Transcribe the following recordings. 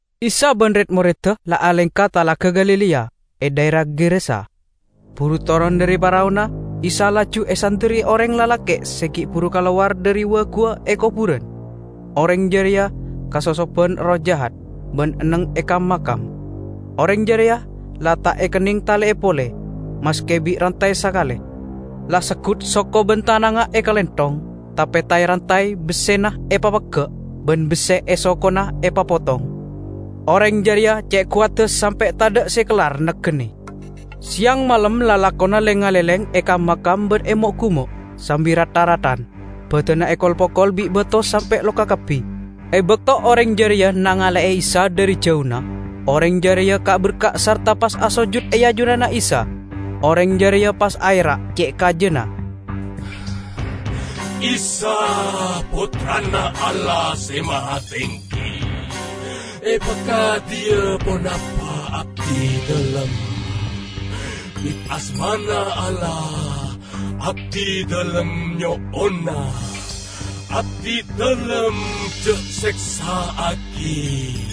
Isa ban red-moredda la alengka Talaga Galilea, e dhaera Gerasa. Buru toron dhari paraona, Isa laju esanderri oreng lalake' se gi' buru kalowar dhari wa-guwa e koburan. Oreng jareya kasosoban erroh jahat ban enneng e kam-makam. Oreng jareya la ta' ekenneng tale'e pole, maske bi' rantay sakale; la seggut soko ban tanangnga ekalenthong, tape tay-rantay bessena epapegga' ban besse e sokona epapotong. Oreng jareya ce' kowadda sampe' tadha' se kellar nagenne. Seyang malem lakona leng-ngaleleng e kam-makam ban e mo'-gumo', sambi rat-tharadan; badanna ekol-pokol bi' bato sampe' loka kabbi. E bakto oreng jareya nangale'e Isa dhari jauna, oreng jareya ka'-berka' sarta pas asojud e ajunanna Isa. Oreng jareya pas aera' ce' kajana, "Isa, Pottrana Allah Se Mahatenggi! Epakadiya ponapa abdidalem? Bit asmana Allah, abdidalem nyo'ona, abdidalem ja' seksa'agi!" (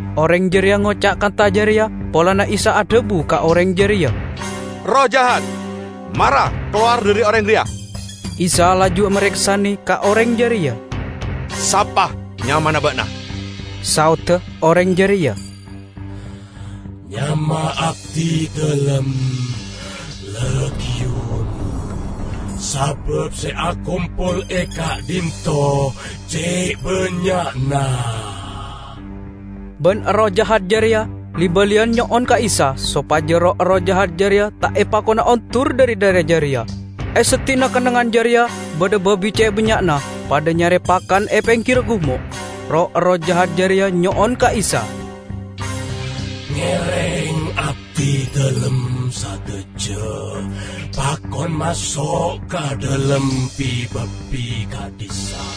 Oreng jareya ngoca' kantha jareya polana Isa adhabu ka oreng jareya, "Erroh jahat, mara kalowar dhari oreng reya!") Isa laju mareksane ka oreng jareya, "Sapa nyamana ba'na?" Saodda oreng jareya, "Nyama abdidalem 'Legiun' -- sabab se akompol e ka'dhinto' ce' bannya'na!" Ban erroh jahat jareya li-baliyan nyo'on ka Isa sopaja roh-erroh jahat jareya ta' epakona ondur dhari dhaera jareya. E seddi'na kennengngan jareya badha babi ce' bannya'na padha nyare pakan e penggirra gumo'. Roh-erroh jahat jareya nyo'on ka Isa, "Ngereng abdidalem sadaja pakon maso' ka dhalem bi-babi ka'dhissa'."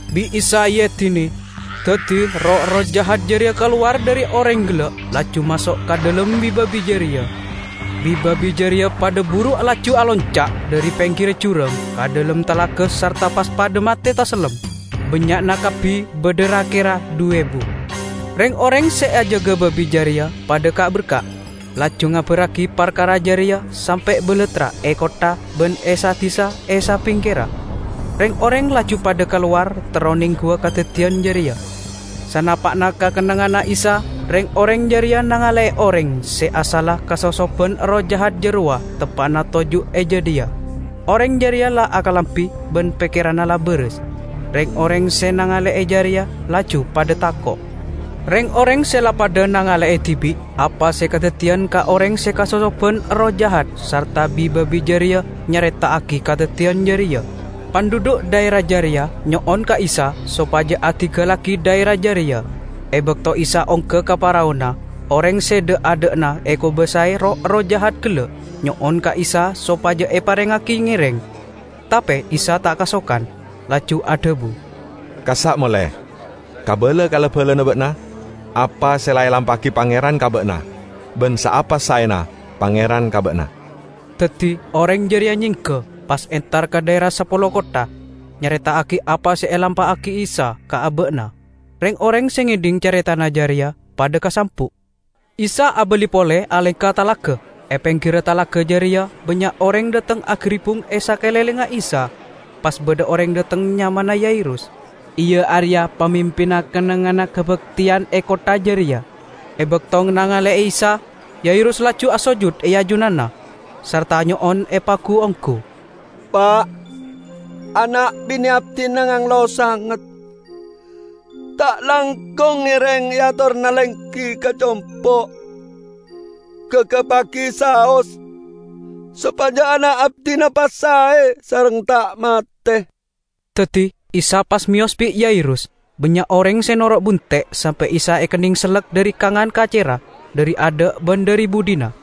Bi' Isa eedine, daddi roh-erroh jahat jareya kalowar dhari oreng gella' laju maso' ka dhalem bi-babi jareya. Bi-babi jareya padha buru laju alonca' dhari penggirra jurang ka dhalem talaga sarta pas padha mate tasellem; bannya'na kabbi badha ra-kera dhu ebu. Reng-oreng se ajaga babi jareya padha ka'-berka', laju ngabarragi parkara jareya sampe' balattra e kottha ban e sa-disa e sabingkerra. Reng-oreng laju padha kalowar terro nengguwa kadaddiyan jareya. Sanapa'na ka kennengnganna Isa, reng-oreng jareya nangale'e oreng se asalla kasosoban erroh jahat jarowa teppa'na toju' e jadhiya. Oreng jareya la akalambi ban pekkeranna la baras. Reng-oreng se nangale'e jareya laju padha tako'. Reng-oreng se la padha nangale'e dibi' apa se kadaddiyan ka oreng se kasosoban erroh jahat sarta bi-babi jareya nyareta'agi kadaddiyan jareya. Pandhudhu' dhaera jareya nyo'on ka Isa sopaja adinggallagi dhaera jareya. E bakto Isa ongga ka paraona, oreng se dha'-adha'na ekobasae roh-erroh jahat gella' nyo'on ka Isa sopaja eparengngagi ngereng. Tape Isa ta' kasokan, laju adhabu, "Kassa' mole, kabala ka la-balana ba'na apa se la elampa'agi Pangeran ka ba'na ban saapa saena Pangeran ka ba'na!" Daddi oreng jareya nyengga, pas entar ka dhaera Sapolo Kottha, nyareta'agi apa se elampa'agi Isa ka aba'na. Reng-oreng se ngedhing careta jareya padha kasambu'. Isa abali pole alengka talaga. E penggirra talaga jareya bannya' oreng dhateng agaribbung e sakalenglengnga Isa. Pas badha oreng dhateng nyamana Yairus, iya areya pamimpinna kennengnganna kabakteyan e kottha jareya. E bakto nangale'e Isa, Yairus laju asojud e ajunanna, sarta nyo'on epagu-onggu, "Pa', ana' bine' abdina nganglo sanget. Ta' langkong ngereng eatorana lenggi ka compo'. Gagappagi saos sopaja ana' abdina pas sae sareng ta' mate!" Daddi Isa pas meyos bi' Yairus. Bannya' oreng se noro' bunte' sampe' Isa ekenneng sellek dhari kangan kacerra, dhari adha' ban dhari budhina.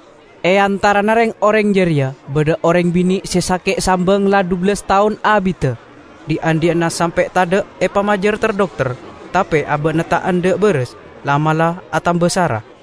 E antarana reng-oreng jareya badha oreng bine' se sake' sambang la dhubellas taon abidda. Dhi'-andhi'na sampe' tadha' epamajar ter-dokter, tape aba'na ta' endha' baras, la'-mala' atamba sara.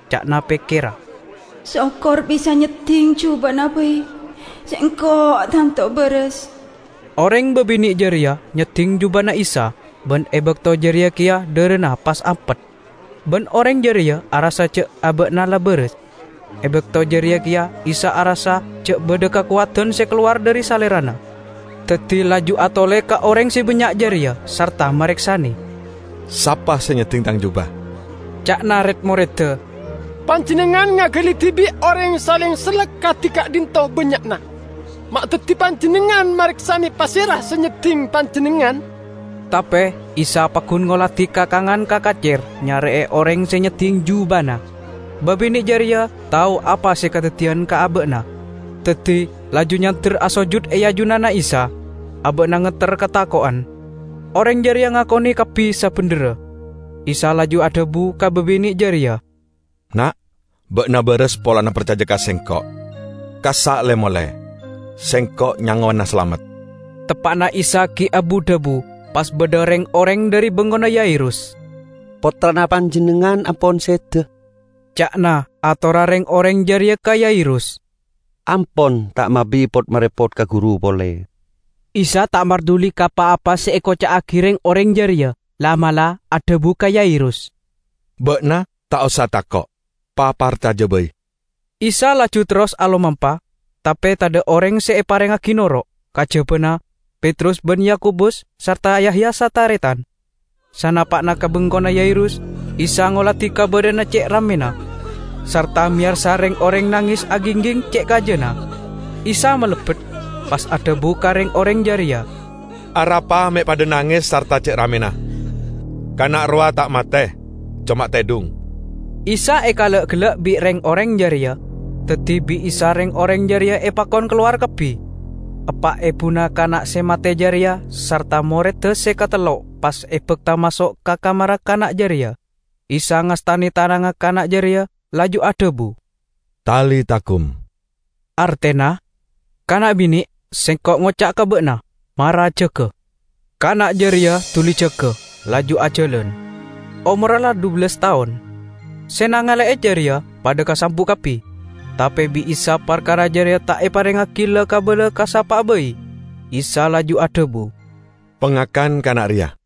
Ca'na pekkerra, "Sokor bisa nyedding jubana bai sengko' tanto baras!" Oreng babine' jareya nyedding jubana Isa, ban e bakto jareya keya dharana pas ampet. Ban oreng jareya arassa ja' aba'na la baras. E bakto jareya keya Isa arassa ja' badha kakowadan se kalowar dhari Salerana, daddi laju atole ka oreng se bannya' jareya sarta mareksane, "Sapa se nyedding Tang juba?" Ca'na red-moredda, "Panjennengngan ngagali dibi' oreng saleng sellek kadi ka'dhinto' bannya'na, ma' daddi Panjennengngan mareksane pasera se nyedding Panjennengngan?" Tape Isa paggun ngoladi ka kangan ka kacer nyare'e oreng se nyedding jubana. Babine' jareya tao apa se kadaddiyan ka aba'na, daddi laju nyander asojud e ajunanna Isa; aba'na ngetter katako'en. Oreng jareya ngakone kabbi sabendherra. Isa laju adhabu ka babine' jareya, "Na', ba'na baras polana parcaja ka Sengko'! Kassa' le-mole; Sengko' nyangowana salamet." Teppa'na Isa gi' abu-dhabu, pas badha reng-oreng dhari bengkona Yairus. "Pottrana panjennengngan ampon seda," ca'na atorra reng-oreng jareya ka Yairus. "Ampon ta' mabi pot-marepot ka Guru pole." Isa ta' marduli ka pa-apa se ekoca'agi reng-oreng jareya, la'-mala' adhabu ka Yairus, "Ba'na ta' osa tako', paparcaja bai!" Isa laju terros alomampa, tape tadha' oreng se eparengngagi noro', kajabana Petrus ban Yakobus sarta Yahya sataretan. Sanapa'na ka bengkona Yairus, Isa ngoladi kabadha'an ce' rammena, sarta meyarsa reng-oreng nanges agingging ce' kajana. Isa malebbet, pas adhabu ka reng-oreng jareya, "Arapa me' padha nanges sarta ce' rammena? Kana' rowa ta' mate; coma tedhung!" Isa ekala'-gella' bi' reng-oreng jareya. Daddi bi' Isa reng-oreng jareya epakon kalowar kabbi. Eppa' ebuna kana' se mate jareya sarta moredda se katello pas ebakta maso' ka kamarra kana' jareya. Isa ngastane tanangnga kana' jareya laju adhabu, "Talita kum," artena, "Kana' bine', Sengko' ngoca' ka ba'na: mara jaga!" Kana' jareya duli jaga, laju ajalan. (Omorra la dhubellas taon.) Se nangale'e jareya padha kasambu' kabbi. Tape bi' Isa parkara jareya ta' eparengngagi la-kabala ka sapa'a bai. Isa laju adhabu, "Pangakan kana' reya!"